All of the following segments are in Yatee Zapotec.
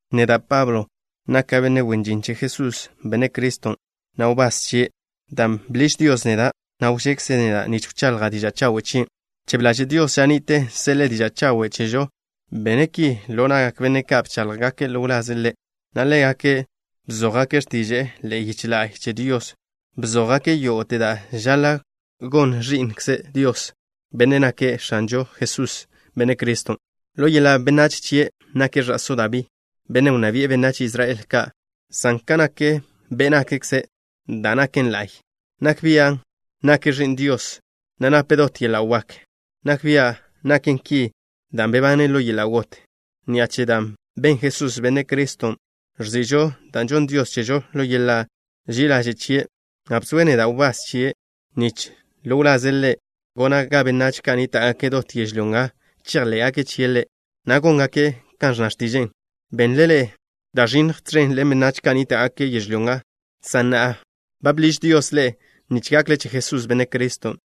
Neda', Pablo, naka' benne' ndo'w che Jesús, Benne' Criston', na' wbás chie', dan' bḻiž Dios neda', na' wžekze' neda' nich wchaḻja' diža' chawe' chien'. Bchebe ḻaže' Dios ža ni'te seḻe'e diža' chawen' chežo. Bene' ki ḻo na'gak benne' ka' bcháḻjgake' ḻo wlaze' Ḻe', na' ḻégake' bzójgake' x̱tiže'e ḻe'e yiche la'y che Dios. Bzójgake' yógo'te da' žaḻa' gon ẕí'nkze Dios, Bennen' nake' X̱anžo Jesús, Benne' Criston'. Ḻo yeḻa' benách chie' nake' ẕa'só Dabí, bennen' wnná bi'e benách Israel ka', san kan nak be' nakkze', da' naken la'y, nak bia' nake' Ẕi'n Dios, na' nape' dot yeḻa' wak. Nak bia' naken ki dan' bebane' ḻo yeḻa' got. Ni'a che da' ben Jesús, Benne' Criston', ẕzi'žo da' žonn Dios chežo ḻo yeḻa' ži'i ḻaže' chie', na' bzoe' neda' wbás chie' nich ḻo wlaze' Ḻe' gona' ga benách ka' nníta'gake' dot yežlyó nga chejḻé'gake' chie' Ḻe', na' góngake' kan ẕnna x̱tiže'e. Benle ḻe'e da' ẕinnj tẕen ḻen benách ka' nníta'gake' yežlyó nga, san na'a ba bḻiž Dios ḻe'e nich gakle che Jesús, Benne' Criston'.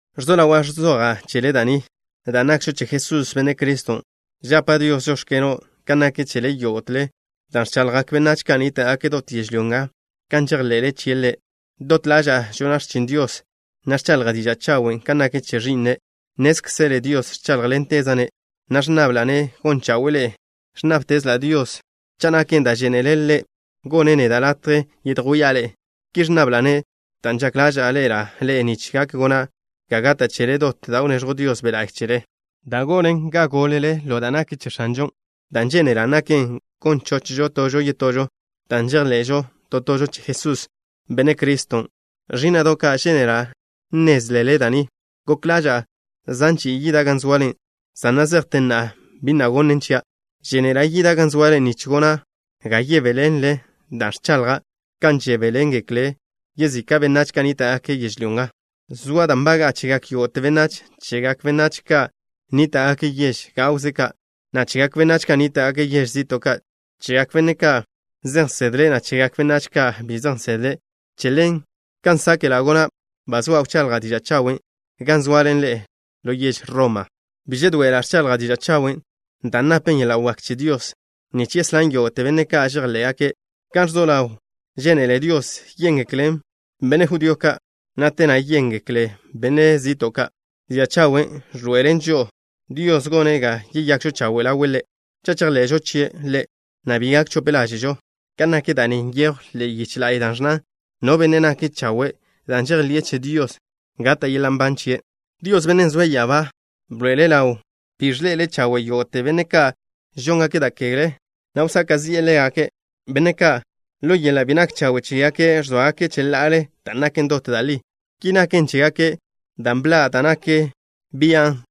Ẕzo ḻawa' ẕzoja' chele da' ni. Dan' nakžo che Jesús, Benne' Criston', žapa' Dios: “Žóx̱keno'” kan nak chele yógo'tele, dan' ẕchaḻjgak benách ka' nníta'gake' dot yežlyó nga kan žejḻe'le chie' Ḻe'. Dot ḻaža'a žona' x̱chin Dios, na' ẕchaḻja' diža' chawen' kan nak che Ẕi'ne'. Nnézkzele Dios ẕcháḻjḻenteza'-ne', na' ẕnnabla'-ne' gon chawe'e ḻe'e. Ẕnnábtezla' Dios, cha' naken da' žénele' Ḻe', gonne' neda' latje yedjwía' ḻe'e. Ki ẕnnabla'-ne' dan' žak ḻaža'a ḻe'ela' ḻe'e nich gak gona' ga gata' chele to da' wneẕjw Dios Be' La'y chele, da' gonen ga gólele ḻo da' nak che X̱anžon'. Dan' žénela' naken gon chochžo tožo yetožo, dan' žejḻe'žo to tožo che Jesús, Benne' Criston'. Ẕí'na'do' ka', žénela' nnézlele da' ni. Gok ḻaža'a zan chi'i yida' gan zoale, san na' zejte na'a bi na' gonnen chia'. Žénela' yida' gan zoale nich gona' ga yebéḻenlele da' ẕchaḻja', kan žebéḻengeklen yezika' benách ka' nníta'gake' yežlyó nga. Zoa da' nbaga'a chegak yógo'te benách, chegak benách ka' nníta'gake' yež gawze ka', na' chegak benách ka' nníta'gake' yež zi'to' ka', chegak benách ka' zej nsedle', na' chegak benách ka' bi zej nsedle'. Che ḻen, kan sáke'la' gona', ba zoa' wchaḻja' diža' chawen' gan zoale ḻe'e ḻo yež Roma. Bi žedoe'ela' ẕchaḻja' diža' chawen', dan' napen yeḻa' wak che Dios nich yeslán yógo'te benne' ka' žejḻé'gaken'. Gan ẕzo ḻaw, žénele Dios yéngeklen benne' judío ka', na' te na' yéngeklen benách zi'to' ka'. Diža' chawen' ẕḻoe'elen žo'o Dios gone' ga yeyakžo chawe' ḻawe' Ḻe', cha' chejḻe'žo chie' Ḻe', na' bi gak chope ḻáže'žo. Kan nak da' ni nyejw ḻe'e yiche la'y, da' ẕnnan: “No benne' nake' chawe' dan' žejḻi'e che Dios, gata' yeḻa' nban chie'.” Dios, Bennen' zoe' ya'abá, bḻoe'ele' ḻaw bi ẕḻe'ele' chawe' yógo'te benne' ka' žóngake' da' kegle, na' wsaka' zi'e ḻégake', benne' ka', ḻo yeḻa' bi nak chawe' chégake' ẕzóagake' cheḻa'ale da' naken dot da' li. Ki naken chégake' dan' bḻa' da' nak bian'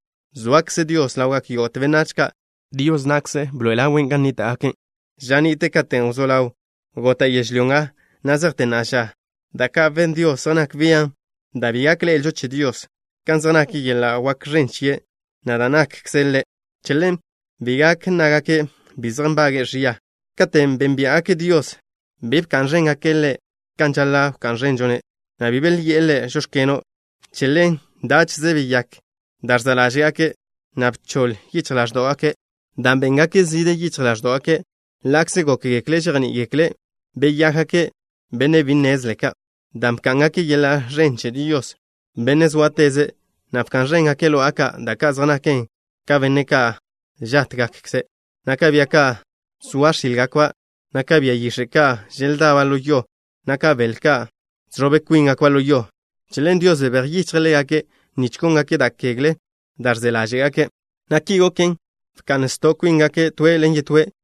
zoakze Dios ḻawgak yógo'te benách ka', dan' Dios na'kze bḻoe'elen' ḻaw gan nníta'gake'. Ža ni'te katen' wzó ḻaw gota' yežlyó nga, na' zejte na'a ža, da' ka' ben Dios zej nak bian' da' bi gak ḻe'elžo che Dios, kan zej nak yeḻa' wak ẕen chie', na' da' nakkze' Ḻe'. Che ḻen, bi gak nnágake' bi zej nbage'e ẕia. Katen' bénbia'gake' Dios, bi bka'n ẕéngake' ḻe' kan žaḻa' wká'n ẕenžo-ne', na' bi belyi'e Ḻe': “Žóx̱keno'.” Che ḻen dáche'ze beyák da' ẕza' ḻáže'gake', na' bchoḻ yichj ḻáẕdo'gake' dan' béngake' zide yichj ḻáẕdo'gake'. Ḻa'kze gókgekle' žejní'iḻe'egekle', beyákgake' benne' bi nnezle ka', dan' bká'ngake' yeḻa' ẕen che Dios, Benne' zóateze', na' bka'n ẕéngake' lo'a ka', da' ka' zej naken ka benne' ka' žátgakkze', na' ka bia ka' zoa x̱ílgakba', na' ka bia yix̱e' ka' želdaba' ḻo yo, na' ka bele ka' žẕob kwíngakba' ḻo yo. Che ḻen Dios bebéj yichje' ḻégake' nich góngake' da' kegle ka' da' ẕze ḻáže'gake', na' ki goken, bka'n sto' kwíngake' toe' ḻen yetóe'.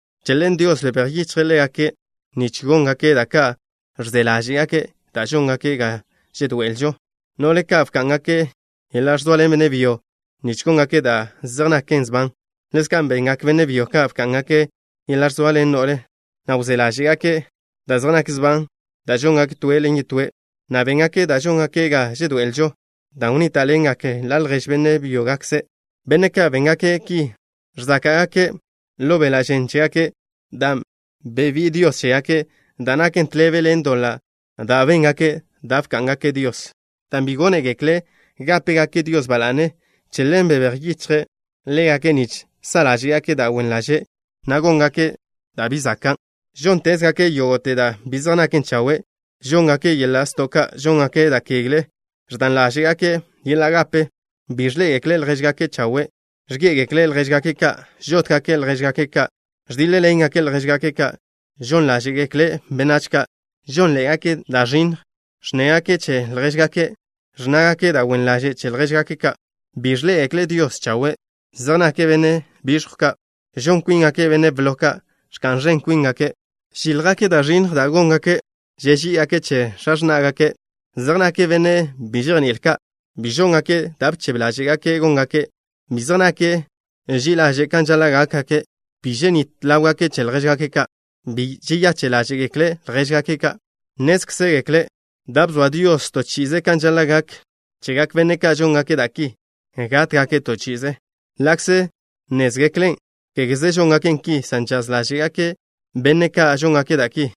Che ḻen Dios bebéj yichje' ḻégake' nich góngake' da' ka' ẕze ḻáže'gake' da' žóngaken ga žedoe'elžo. No'le ka' bká'ngake' yeḻa' ẕzoaḻen benne' byo, nich góngake' da' zej naken sban. Ḻezka' bengak benne' byo ka', bká'ngake' yeḻa' ẕzoaḻen no'le, na' wzé ḻáže'gake' da' zej nak sban da' žóngake' toe' ḻen yetóe', na' béngake' da' žóngaken ga žedoe'elžo, dan' wnníta'ḻengake' ḻa' ljež benne' byógakze'. Benne' ka' béngake' ki ẕzáka'gake' ḻo beḻa' žen chégake' dan' bebí'i Dios chégake' da' naken tḻebe ḻen doḻan' da' béngake' dan' bká'ngake' Dios. Dan' bi gónegekle' gápegake' Dios ba la'ne, che ḻen bebéj yichje' ḻégake' nich sa' ḻáže'gake' da' wen ḻaže', na' góngake' da' bi zakan'. Žóntezgake' yógo'te da' bi zej nak chawe'. Žóngake' yeḻa' sto' ka'. Žóngake' da' kegle. Ẕdan ḻáže'gake' yeḻa' gape. Bi ẕḻé'egekle' ljéžgake' ka' chawe'. Ẕgé'egekle' ljéžgake' ka'. Žótgake' ljéžgake' ka'. Ẕdíḻ-ḻengake' ljéžgake' ka'. Žon ḻáže'gekle' benách ka'. Žónḻe'egake' da' ẕinnj. Ẕnnégake' che ljéžgake' ka'. Ẕnnágake' da' wen ḻaže' che ljéžgake' ka'. Bi ẕḻé'egekle' Dios chawe'. Zej nake' benne' biẕjw ka'. Žon kwíngake' benne' blo ka'. Ẕka'n ẕen kwíngake'. Žíljgake' da' ẕinnj da' góngake'. Žeží'igake' che x̱a x̱ná'gake'. Zej nake' benne' bi žejní'il ka'. Bi žóngake' da' bchebe ḻáže'gake' góngake'. Bi zej nake' ži'i ḻaže' kan žaḻa' gákgake'. Bi ženít ḻáwgake' che ljéžgake' ka'. Bi žeyache' ḻáže'gekle' ljéžgake' ka'. Nnézkzegekle' da' bzoa Dios to chi'ize kan žaḻa' gak chegak benne' ka' žóngake' da' ki, gátgake' to chi'ize. Ḻa'kze nnézgeklen', kégeze žóngake' ki, san žaz ḻáže'gake' benne' ka' žóngake' da' ki.